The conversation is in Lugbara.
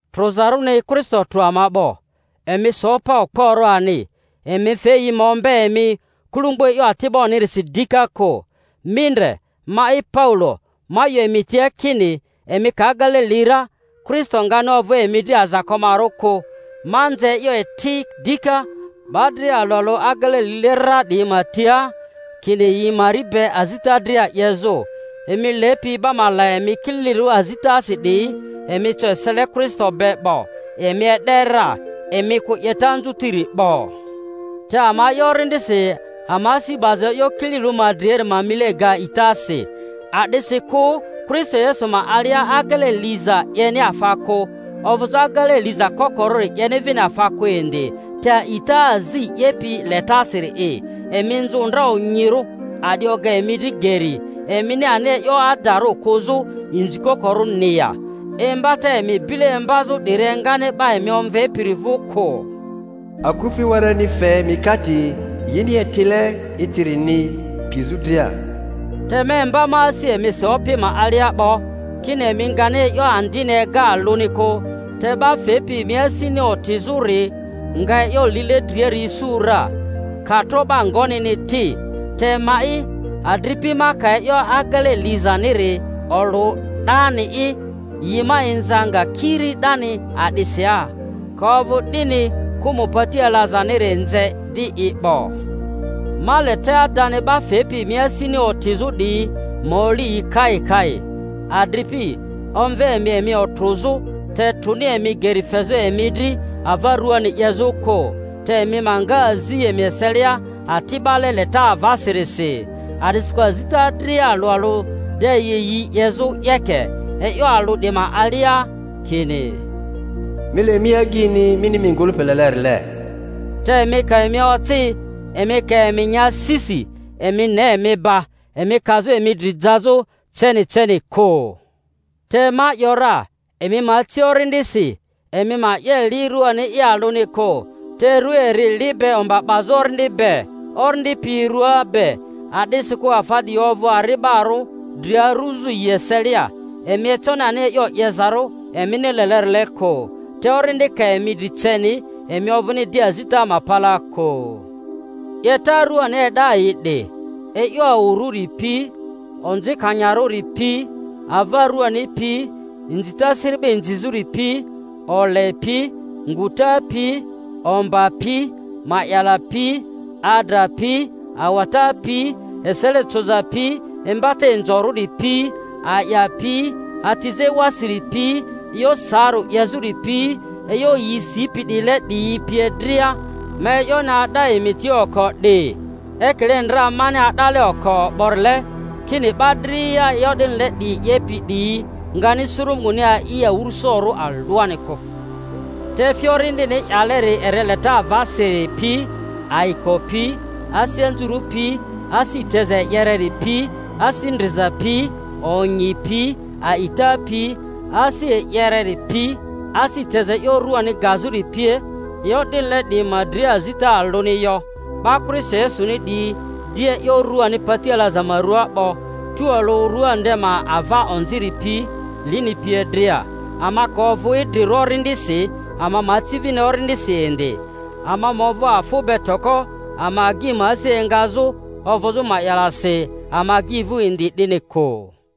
Trᴜzarᴜni, Kristo trᴜ ama 'bo; emi so pa okporᴜ ani, emi fe yi ma ombe emi kulumbu e'yo ati'bo-nirisi dika kᴜ. Mi ndre, ma'i Paulo, ma 'yo emi tia kini emi ka agele li ra, Kristo ngani ovᴜ emi dri azakomarᴜ kᴜ. Ma nze e'yo eti dika 'ba dria alᴜ alᴜ agele lile ra 'diyi ma tia, kini yi mari be azita dria 'yezᴜ. Emi lepi 'ba ma la emi kililirᴜ azitasi 'diyi, emi co esele Kristo be 'bo; emi e'de ra, emi kᴜ 'yeta anzutiri 'bo. Te ama'i, Orindisi ama asi 'baza e'yo kililirᴜri ma driari ma mile ga a'itasi. A'disikᴜ Kristo Yesu ma alia agele liza 'yeni afa kᴜ, ovᴜzᴜ agele liza kokorᴜri 'yeni vini afa kᴜ indi, te a'ita azi 'yepi letasiri'i. Emi nzᴜ ndra onyirᴜ; a'di oga emi dri geri, emini ani e'yo adarᴜ kᴜzᴜ inzikoko-rᴜni ya? Imbata emi bile imbazᴜ 'diri engani 'ba emi omvepiri vᴜ kᴜ. Akufi wereni fe mikate yini etile etirini pizᴜ dria. Te ma imba ma asi emisi Opi ma alia 'bo, kini emi ngani e'yo andini ega alᴜni kᴜ; te 'ba fepi emi asini otizᴜri nga e'yo lile driari isu ra, ka tro 'ba ngonini ti. Te ma'i, adripi, ma ka e'yo agele lizaniri olᴜ 'dani'i, yi ma inza nga kiri 'dani a'disi ya? Ka ovᴜ 'dini kᴜmᴜ pati alazaniri nze di i 'bo. Ma le te adani 'ba fepi emi asini otizᴜ 'diyi ma oli yi kai kai! Adripi, omve emi emi otrᴜzᴜ; te trᴜni emi geri fezᴜ emi dri ava ruani 'yezᴜ kᴜ, te emi ma nga azi emi eselia ati'bale leta avasirisi. A'disikᴜ azita dria alᴜ alᴜ de yi yi 'yezᴜ 'yeke e'yo alᴜ 'di ma alia. kini, Mi le mi agyini mini mi ngᴜlᴜpi lelerile. Te emi ka emi oci, emi ka emi nya sisi, emi ne emi ba emi kazᴜ emi dri jazᴜ ceni ceni kᴜ. Te ma ‘yora, Emi ma aci Orindisi, emi ma 'ye li ruani'i alᴜni kᴜ. Te rᴜa eri li be omba 'bazᴜ Orindi be, Orindi pi rua be; a'disikᴜ afa 'diyi ovᴜ ari'barᴜ, dri aruzᴜ yi eselia, emi econi ani e'yo 'yezarᴜ emini lelerile kᴜ. Te Orindi ka emi dri ceni, emi ovᴜni di azita ma palaa kᴜ. 'Yeta ruani e'da yi 'di: e'yo awurᴜri pi, onzikanyarᴜri pi, ava ruani pi, inzita siri'ba inzizᴜri pi, ole pi, nguta pi, omba pi, ma'yala pi, adra pi, awata pi, esele coza pi, imbata inzorᴜri pi, a'ya pi, atizᴜ ewasiri pi, e'yo saarᴜ 'yezᴜri pi, e'yo yi sipi 'diyile 'diyi pie dria. Ma e'yoni a'da emi tia oko 'di, ekile ndra mani a'dale oko 'borile, kini 'ba dria e'yo 'dinile 'diyi 'yepi 'diyi ngani suru Munguni a'i awᴜrᴜsorᴜ alᴜani kᴜ. Te efi Orindini 'yaleri eri leta avasiri pi, ayiko pi, asi anzuru pi, asi teza e'yereri pi, asi ndriza pi, onyi pi, a'ita pi, asi e'yereri pi, asi teza e'yo ruani gazᴜri pie; e'yo 'dinile 'diyi ma dria azita alᴜni yo. 'Ba Kristo Yesuni 'diyi di e'yo ruani pati alaza ma rᴜaa 'bo, tualᴜ rua nde ma ava onziri pi, lini pie dria. Ama ka ovᴜ idrirᴜ Orindisi, ama ma aci vini Orindisi indi. Ama ma ovᴜ afᴜ be toko, ama agyi ma asi engazᴜ, ovᴜzᴜ ma'yalasi ama agyi vᴜ indi 'dini kᴜ.